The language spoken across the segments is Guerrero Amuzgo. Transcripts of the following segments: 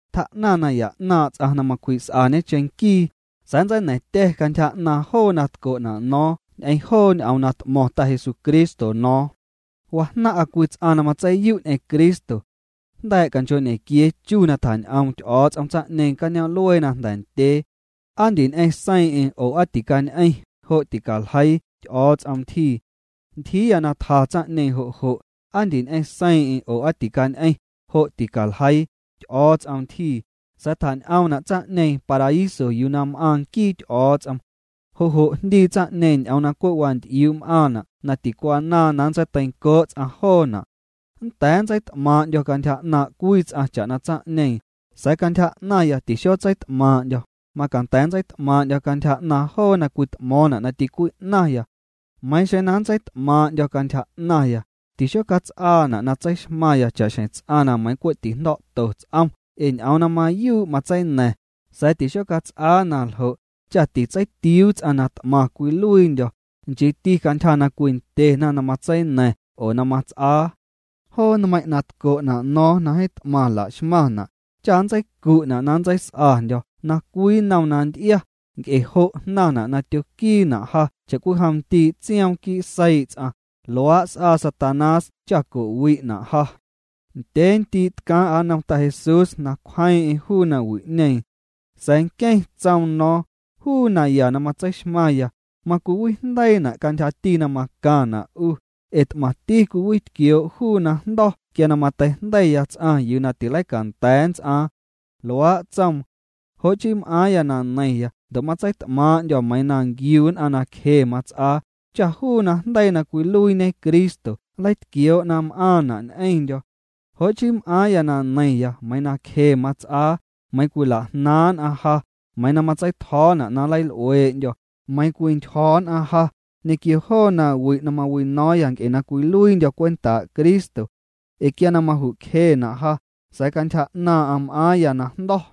Tjaa'naⁿ naya 'naaⁿ' ts'aⁿ na macwji's'añe cheⁿnquii, sa̱a̱ nntseina̱ⁿtya̱ cantyja 'naaⁿ' joo na tco'na' no̱o̱ⁿ ñ'eⁿ joo ñ'oom na t'mo̱ⁿ Ta Jesucristo no̱o̱ⁿ. Wajnaⁿ'a cwii ts'aⁿ na matseiyu' ñ'eⁿ Cristo. Jnda̱a̱' canchoo'ñequiee chu na tjañ'oom Ty'o̱o̱ts'om tsaⁿ'ñeeⁿ cañoom'luee na jnda̱ ndyee. Aa ndiñ'eⁿ seiiⁿ'eⁿ oo aa ticañ'eⁿ, jo' ticaljeii, Ty'o̱o̱ts'om ntyjii. Ntyjiiya na tja tsaⁿ'ñeeⁿ jo' jo', ¿aa ndiñ'eⁿ seiiⁿ'eⁿ oo aa ticañ'eⁿ? jo' ticaljeii, Ty'o̱o̱ts'om ntyjii, sa̱a̱ tjañ'oomna' tsaⁿ'ñeeⁿ paraíso yuu na m'aaⁿ nquii Ty'o̱o̱ts'om. Jo' jo' jndii tsaⁿ'ñeeⁿ ñ'oom na cwe' wanty'iuu' m'aaⁿna' na ticwanaaⁿ na nntseiteincoo' ts'aⁿ joona'. Nnda̱a̱ nntseit'maaⁿ'ndyo̱ cantyja 'naaⁿ' cwii ts'aⁿ cha'na tsaⁿ'ñeeⁿ, sa̱a̱ cantyja 'naⁿya tixotseit'maaⁿ'ndyo̱, macanda̱a̱ nntseit'maaⁿ'ndyo̱ cantyja 'naaⁿ joo na cwit'mo̱o̱ⁿna' na ticwi'naⁿya. Meiiⁿ xeⁿ na nntseit'maaⁿ'ndyo̱ cantyja 'naⁿya, tixocats'aana' na tseixmaⁿya cha'xjeⁿ ts'aⁿ na meiⁿ cwe' tijndo̱'to ts'om ee ñ'oom na mayuu' matseina̱ⁿ, sa̱a̱ tixocats'aa na ljo', cha titseitiuu ts'aⁿ na t'maⁿ cwiluiindyo̱, nchiiti cantyja na cwindyena na matseina̱ⁿ oo na mats'aa. Joo nmeiⁿ' na tco'na' no̱o̱ⁿ na jeeⁿ t'maⁿ la'xmaⁿna', cha nntseicu'na' na nntseis'andyo̱ na cwii nnom na nty'ia, nc'e jo' jnaⁿna' na tyoquiina' ja cha'cwijom ndii' tsioom quii' seii' ts'aⁿ, luaa' s'aa Satanás cha co'wi'na' ja. Ndyee ndii' tcaaⁿ'a nnom Ta Jesús na cwjeeⁿ'eⁿ juu nawi'ñeeⁿ. Sa̱a̱ nqueⁿ tsoom no̱o̱ⁿ: “Juu naya na matseixmaⁿya, macwiwijndeiina' cantyjati na macaⁿna' 'u, ee t'maⁿti cwiwitquioo' juu najndo̱ quia na mateijndeiya ts'aⁿ yuu na tileicanda̱a̱ nnts'aaⁿ.” Luaa' tsoom. Jo' chii m'aaⁿya na neiⁿya ndo' matseit'maaⁿ'ndyo̱ meiiⁿ na nquiu nn'aⁿ na cje mats'aa, cha juu najndeii na cwiluiiñe Cristo nleitquioo' na m'aaⁿna' ñ'eⁿndyo̱. Jo' chii m'aaⁿya na neiⁿya meiiⁿ na cje mats'aa, meiiⁿ cwila'jnaaⁿ' nn'aⁿ ja, meiiⁿ na matseitjo̱o̱na' na nleil'uee'ndyo̱, meiiⁿ cwintyjo̱ nn'aⁿ ja, ñequio joo na wi' na mawino̱o̱ⁿya nc'e na cwiluiindyo̱ cwentaa' Cristo. Ee quia na majucjena' ja, sa̱a̱ cantyja 'naaⁿ'aⁿ m'aaⁿya najndo̱.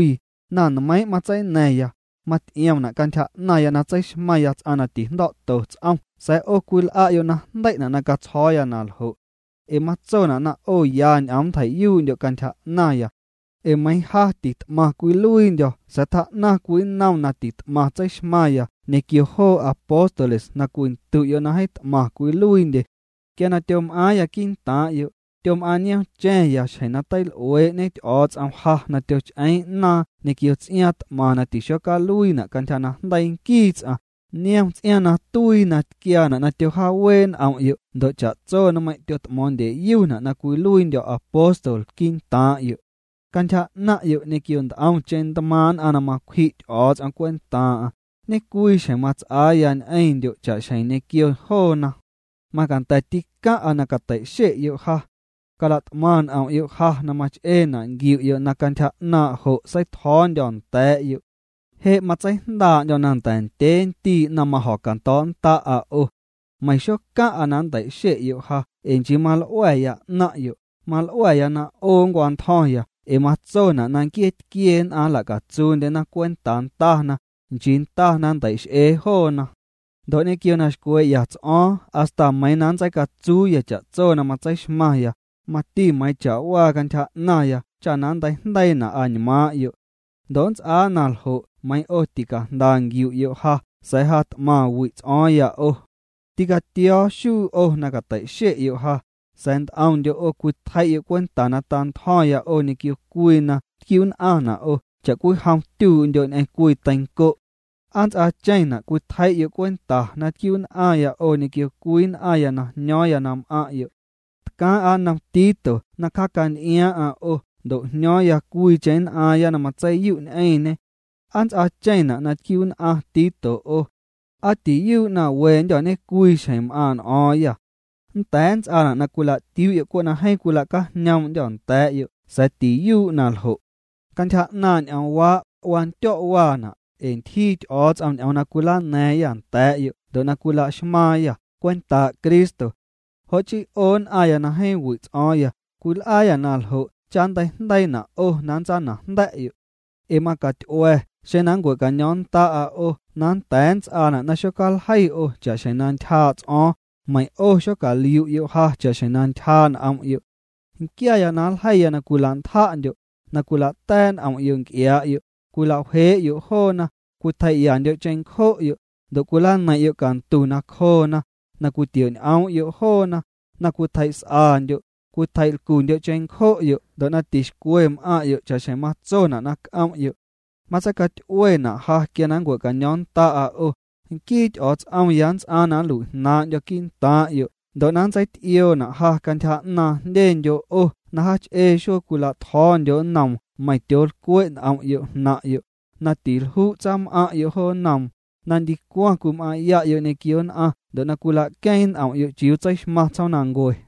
Na nmeiiⁿ' matseina̱ⁿya, maty'iomna' cantyja 'naⁿya na tseixmaⁿya ts'aⁿ na tijndo̱'to ts'om sa̱a̱ 'o cwil'a'yo' najndei'na' na catsjo̱o̱ya na ljo'. Ee matsona' na 'o ya ñ'oom nntjei'yuu'ndyo' cantyja 'naⁿya. Ee meiiⁿ ja tit'maⁿ cwiluiindyo̱ sa̱a̱ tjaa'naⁿ cwii nnom na tit'maⁿ tseixmaⁿya ñequio joo apóstoles na cwindu'yo' na jeeⁿ t'maⁿ cwiluiindye. Quia na tyom'aaⁿya quii'ntaaⁿ'yo', tyom'aaⁿ niomcha̱ⁿya xjeⁿ na teil'uee'ñe Ty'o̱o̱ts'om ja na tyoch'eeⁿ 'naaⁿ ñequio ts'iaaⁿ t'maⁿ na tixocaluiina' cantyja najndeii nquii ts'aⁿ, niom ts'iaaⁿ na tuii na tquiaana' na tyojaawee' n'om'yo' ndo' cha'tso nmeiⁿ' tyot'mo̱o̱ⁿndyeyuna' na cwiluiindyo̱ apóstol quii'ntaaⁿ'yo'. Cantyja 'naⁿ'yo' ñequio nt'omche ntmaaⁿ' nn'aⁿ na macwji' Ty'o̱o̱ts'om cwentaaⁿ'aⁿ, ñecwii xjeⁿ mats'aaya ñ'eⁿndyo' cha'xjeⁿ ñequio joona. Macanda̱ tîcaⁿ'aⁿ na catei'xe'yo' ja. Calat'maⁿ n'om'yo' ja na mach'eena' nquiu'yo' na cantyja 'naaⁿ' jo' seitjo̱o̱ndyo̱ nda̱a̱'yo'. Je' matseijndaa'ndyo̱ na nnda̱ ndyee ndii' na majo̱cando̱o̱'nnda'a 'o. Meiⁿ xocaⁿ'a na nntei'xe'yo' ja ee nchii mal'ua̱ya 'naⁿ'yo', mal'ua̱ya na 'o ncwantjo̱ⁿya ee matsona' na nquiee tquie nn'aⁿ nla'catsuundyena cwentaa ndana, nchii ndana nnteix'ee joona. Ndo' ñequio na xcwee'ya ts'o̱o̱ⁿ hasta meiiⁿ na nntseicatsuuya cha'tso na matseixmaⁿya, mati meiiⁿ cha'waa cantyja 'naⁿya cha na nnteijndeiina' añmaaⁿ'yo'. Ndo' nnts'aa naljo' meiiⁿ 'o ticajnda nquiu'yo' ja sa̱a̱ ja t'maⁿ wi'ts'o̱o̱ⁿya 'o. Tîcatio̱o̱ xuu 'o na catei'xe'yo' ja, sa̱a̱ nt'omndyo' 'o cwitjei'yo' cwenta na ta'ntjo̱ⁿya 'o ñequio cwii na tquiu'nn'aⁿna' 'o cha'cwijom tyuu'ndyo' ñ'eⁿ cwii teiⁿco'. ¿Aa nnts'aacheⁿna' cwitjei'yo' cwenta na tquiu'nn'aⁿya 'o ñequio cwii nn'aⁿya na jño̱o̱ⁿya na m'aⁿ'yo'? Tcaaⁿ'a nnom Tito na cjacanty'iaaⁿ'aⁿ 'o ndo' jño̱o̱ⁿya cwiicheⁿ nn'aaⁿya na matseiyu' ñ'eⁿñê. ¿Aa nnts'aacheⁿna' na tquiu'nn'aⁿ Tito 'o? ¿Aa tiyuu' na wendyô̱ ñecwii xjeⁿ m'aaⁿ' n'o̱o̱ⁿyâ? Nnda̱a̱ nnts'aana' na cwila'tiuu'yo' cwe' na jeeⁿ cwila'cajñoom'ndyô̱ nda̱a̱'yo' sa̱a̱ tiyuu' naljo'. Cantyja 'naaⁿ' ñ'oomwaa', wandyo̱' waana', ee ntyjii Ty'o̱o̱ts'om ñ'oom na cwilana̱a̱ⁿyâ nda̱a̱'yo' ndo' na cwila'xmaaⁿyâ cwentaa' Cristo. Jo' chii 'o nn'aⁿya na jeeⁿ wi' ts'o̱o̱ⁿya, cwil'aayâ na ljo' cha nnteijndeiina' 'o na nntsanajnda̱'yo'. Ee macaty'ua̱ xeⁿ na nncua̱caño̱o̱ⁿnnda'a 'o nnda̱a̱ nnts'aana' na xocaljeiya 'o cha'xjeⁿ na ntyjaa' ts'o̱o̱ⁿ, meiⁿ 'o xocaliu'yo' ja cha'xjeⁿ na ntyjaa' n'om'yo'. Nquiaya na nljeiya na cwila'ntja'ndyo', na cwila'ta̱a̱' n'om'yo' nc'iaa'yo', cwilawjee'yo' joona, cwitjei'ya'ndyo' cheⁿncjo'yo', ndo' cwilaneiⁿ'yo' cantu nacjoona, na cwitio'ñ'oom'yo' joona, na cwitjei's'andyo', cwitjei'lcundyo' cheⁿncjo'yo' ndo' na tixcwe m'aⁿ'yo' cha'xjeⁿ matsona' na c'om'yo'. Matseicaty'uena' ja quia na ncua̱caño̱o̱ⁿnnda'a 'o, nquii Ty'o̱o̱ts'omya nnts'aaⁿ na nlui'jnaaⁿ'ndyo̱ quii'ntaaⁿ'yo' ndo' na nntseity'ioona' ja cantyja 'naaⁿ jndyendyo' 'o na jaach'ee xuee cwila'tjo̱o̱ndyo' nnoom meiⁿ tyoolcwe' n'om'yo' jnaⁿ'yo', na tilju' tsaam'aⁿ'yo' jo nnoom, na ndicwaⁿ cwim'aⁿ'ya'yo' ñequio nn'aⁿ ndo' na cwila'queeⁿ n'om'yo' chiuu tseixmaⁿ tsjoomnancue.